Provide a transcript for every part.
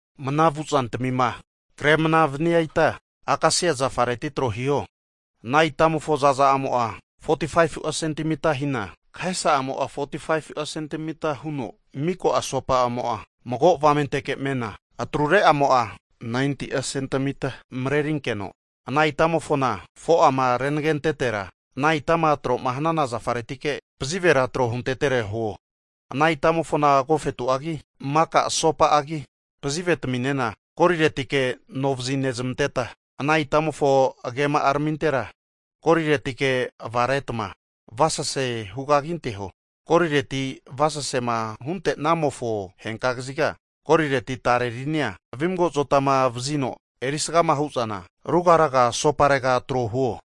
Mnama vu zantamima kre mnama vania ita, akasia zafareti tro hiho. Ana itamofo za'za'amo'a 45'a sentimita hina, kahesa'amo'a 45'a sentimita huno, mika asopa'amo'a mago avamenteke mena, atrure'amo'a 90'a sentimita marerinkeno, ana itamofona 4'ama renagentetera ana itama tro'ma hanana zafaretike pazivera tro huntetere huo. Ana itamofona agofetu'agi, maka asopa'agi pazivetaminena goliretike anovazi nezmanteta, ana itamofo agema'aramintera goliretike avaretma avasasea hu kaginteho. Golireti'ma avasasema hunte'namofo henka kaziga, golireti tare rinia vimago azotama vazino eri sgama hu'zana ruga ruga asoparega tro huo.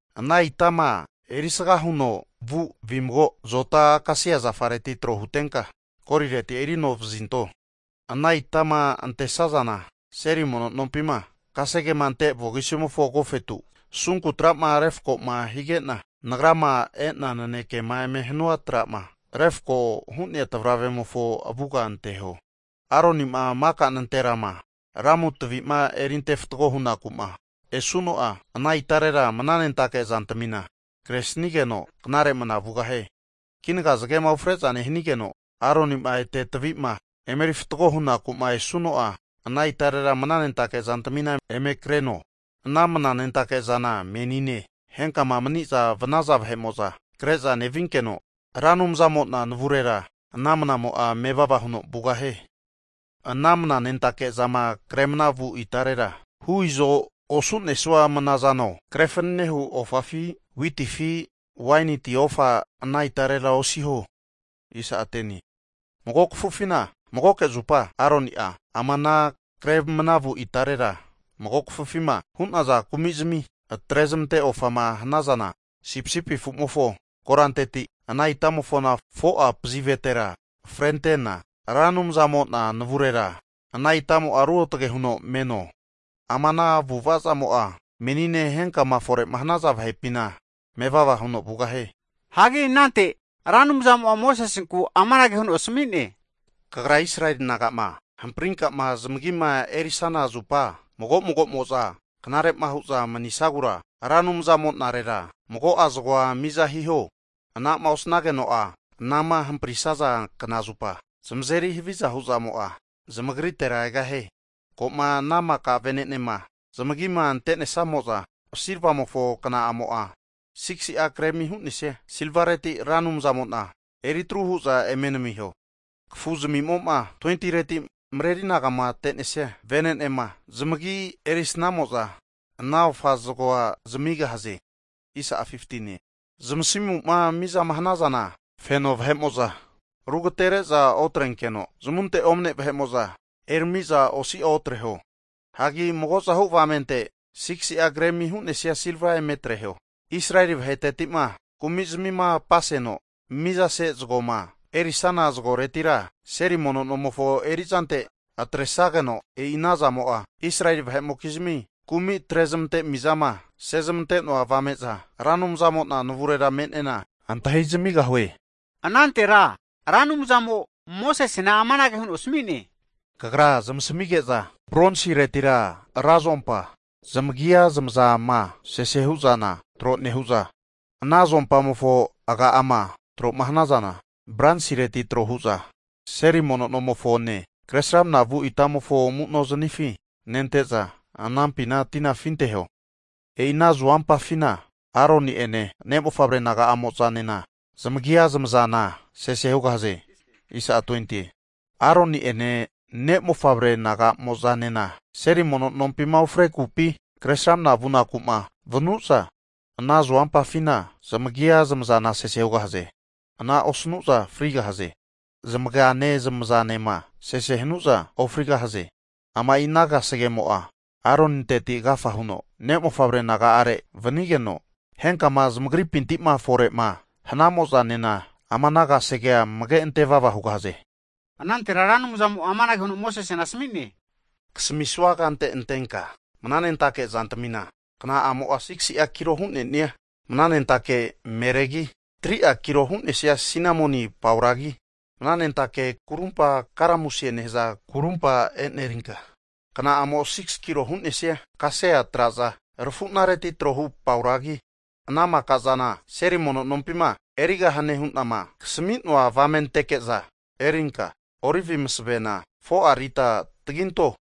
Ana itama eri sgama huno vu vimago azota akasia zafareti tro hutenka golireti erinovazinto. Ana itama antesazana seli mono nompima kasege ante vogisimofo agofetu asunku tra'ma refko'ma hige'na, Nagra'ma e'na nanekema eme hanua tra'ma refko hu'nea tavravemofo avuga anteho. Aroni'ma maka nanterama lamu tavi'ma erinte fatgo hunaku'ma esuno'a, ana itarera mnanentake zantamina kresnigeno knare mana vugahie. Kinaga zagema ufre'za nehanigeno Aroni'ma ete tavi'ma eme eri fatgo hunaku'ma esuno'a, ana itarera mnanentake zantamina eme kreno. Ana mnanentake zana menine henkama mani'zama vanaza vahe'mo'za kre'za nevinkeno, Ra Anumzamo'na navurera ana mnamo'a mevava huno vugahie. Anama mnanentake zama kre mnama vu itarera, hu izo osu'nesua mana zano, kre fanana hu ofafi, witifi waini ti ofa ana itarera osiho. Mago kafufina magoke zupa Aroni'a ama ana kre mnavu itarera mago kafufima hu'naza kumizmi atre'zmante ofama hanaza sipisipi afu'mofo koranteti ana itamofo 4'a pazivetera frentena Ra Anumzamo'na navurera ana itamo'a ruotage huno meno. Ama ana avu'avazamo'a menine henkama fore'ma hanaza vahepina mevava huno vugahie. Hagi anante Ra Anumzamo'a Mosesenku amanage huno asami'ne, Kagra Israeli naga'ma hamprinkama zamagima erisana zupa mago mago'mo'za knare'ma hu'za manisagura, Ra Anumzamo'narera mago'a zagoa miza hiho. Anama osnageno'a, anama hamprisaza knazupa zamazeri haviza hu'zamo'a zamagritera egahie. Ko'ma ana maka vene'nema zamagima ante'nesamo'za, silvamofo kna'amo'a 6'a gremi hu'nesia silvareti Ra Anumzamo'na ofa eri atru hu'za eme namiho. Kafu zamimo'ma 20reti mreri anagamate'nesia vene'nema zamagi erisnamo'za ana ofa zagoa zamigahaze. Zmasimu'ma mizama hanazana, feno vahe'mo'za rugatere'za otrenkeno, zamunte omane vahe'mo'za erami'za osi'a otreho. Hagi mago'zahu avamente 6'a gremi hu'nesia silva eme atreho. Israeli vaheteti'ma kumi'zamima apaseno mizase zagoma erisana zagoretira, seli mono nomofo erizante atresageno, e'i ana zamo'a Israeli vahe'mokizmi kumi atre'zmantena mizama sezmante'noa avame'za Ra Anumzamo'na navurera me'nena antahi zamigahue. Anantera Ra Anumzamo'a Mosesena amanage huno asami'ne, Kagra zamasamige'za bronsireti ra zuompa zamagia zamazama sese hu'zana tro nehu'za, ana zuompamofo aga'ama tro'ma hanazana bronsireti tro hu'za, seli mono nomofone kresramna vu itamofo amu'no zanifi nente'za, anampina tina afinteho. E'i ana zuompafina Aroni'ene ne' mofavre naga'amo'zanena zamagia zamazana sese hugahaze. Aroni'ene ne' mofavre naga'mozanema Seri mono nompima ufrekupi, Kresramana vunaku'ma vanu'za, ana zuompafina zamagia zamazana sese hugahaze. Ana osanu'za frigahaze. Zamagra zamagane zamazanema sese hanu'za ofrigahaze. Ama'i ana kasegemo'a Aroninteti agafa huno ne' mofavre naga'are vanigeno, henkama zamagripinti'ma fore'ma hnamozanena ama ana kasegea amege ante vava hugahaze. Anantera Ra Anumzamo'a amanage huno Mosesena asami'ne, Kasamisua kante antenka mnanentake zantamina, kna'amo'a 6si'a kilo hu'ne'nia mananentake meregi, 3'a kilo hu'nesia sinamoni pauragi, mana nentake kurumpa karamusie nehaza kurumpa e'nerinka, kna'amo'a 6'a kilo hu'nesia kasia traza rafunareti trohu pauragi, ana maka'zana seli mono nompima erigahane hu'nama kasami'noa avamenteke'za erinka, olivi masavena 4'a lita taginto.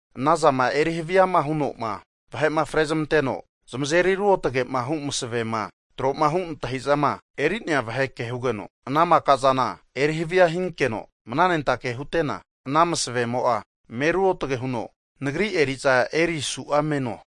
Anazama eri haviama huno'ma vahe'ma frezmanteno zamazeri ruotage'ma hu masavema tro'ma hu' antahi'zama eri'nea vahe ke hugeno, ana maka zana erihavia hinkeno mnanentake hute'na, ana masavemo'a me ruotage huno Nagri eri'za erisu'a meno.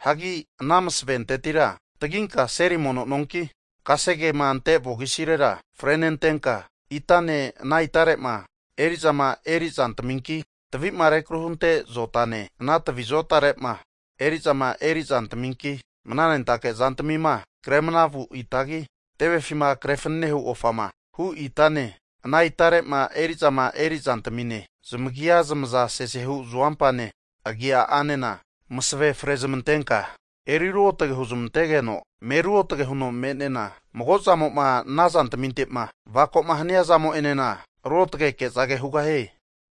Hagi ana masaventetira taginka seli mono nonki, kasegema ante vogisirera frenentenka, itane ana itare'ma eri'zama eri zantaminki, tavi'ma rekru hunte zotane ana tavi zotare'ma eri'zama erizantaminki, mananentake zantamima kre mana vu itagi, tevefima kre fanane hu ofama hu itane, ana itare'ma e'rizama eri zantamine, zamagia zamaza sesehu zuompane agianena, masave fre zamantenka eri ruotage huzamantegeno, me ruotage huno me'nena mago zamo'ma ana zantaminte'ma avako'ma hania zamo'enena ruotageke'za hugahie.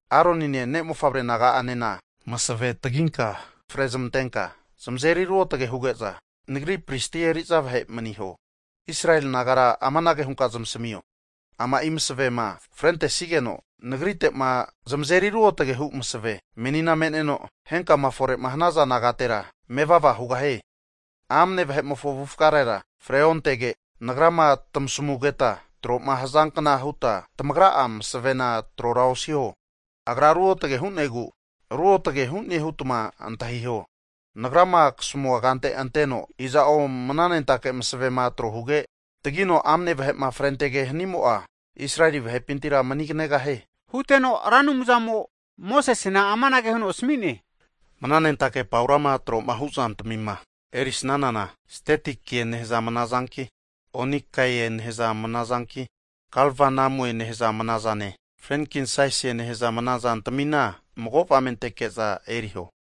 Aronine ne' mofavre naga'anena masave taginka fre zamantenka zamazeri ruotage huge'za Nagri pristi eri'za vahe maniho. Israeli nagara amanage hunka zamasamio, ama'i masavema frentesigeno Nagrite'ma zamazeri ruotage hu maseve menina me'neno, henkama fore'ma hanaza nagatera mevava hugahie. Amne vahe'mofo avufgarera freontege, Nagrama tamasamugeta tro'ma hazankna hutma tamagra'a masavena trora osiho, agra ruotage hu'negu ruotage hu'ne hutma antahiho. Nagrama kasamua kante anteno iza'o mnanentake masavema tro huge, tagino amne vahe'ma frentege hanimo'a, Israeli vahepintira maniganegahie. Huteno Ra Anumzamo Mosesena amanage huno asami'ne, Mnanentake paurama tro'ma hu zantamima erisnanana, stetikie nehaza mnazanki, onikae nehaza mana zanki, galbanamue nehaza mana zane frenkinsesie nehaza mnazantamina mago avamenteke'za erio.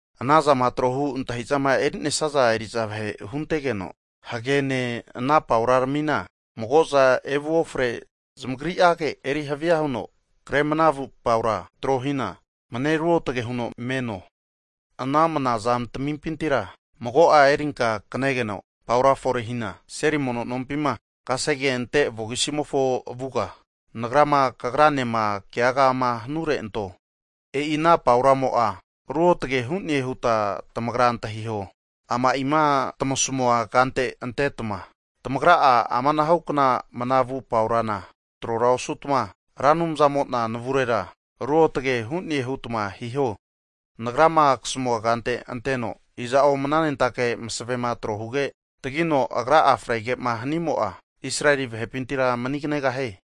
Anazama tro hu antahi'zama eri'nesia eri'za vahe huntegeno, hagene ana paura ramina mago'za evu ofre zamagri'age eri hava huno kre mana vu paura tro hina mane ruotage huno meno. Ana mana zantamimpintira mago'a erinka kanegeno paura forehina seli mono nompima, kasege ante vogisimofo avuga, nagrama kagranema keagama hanure anto. E'i ana pauramo'a ruotage hu'ne huta tamagra antahiho. Ama'ima tamasamua kante anteta tamagra'a amanahukna mana vu paurana trora osutma, Ra Anumzamo'na navurera ruotage hu'ne hutma hiho. Nagrama kasamua kante anteno iza'o mnanentake masavema tro huge, tagino agra'a frege'ma hanimo'a Israeli vahepintira maniganegahie.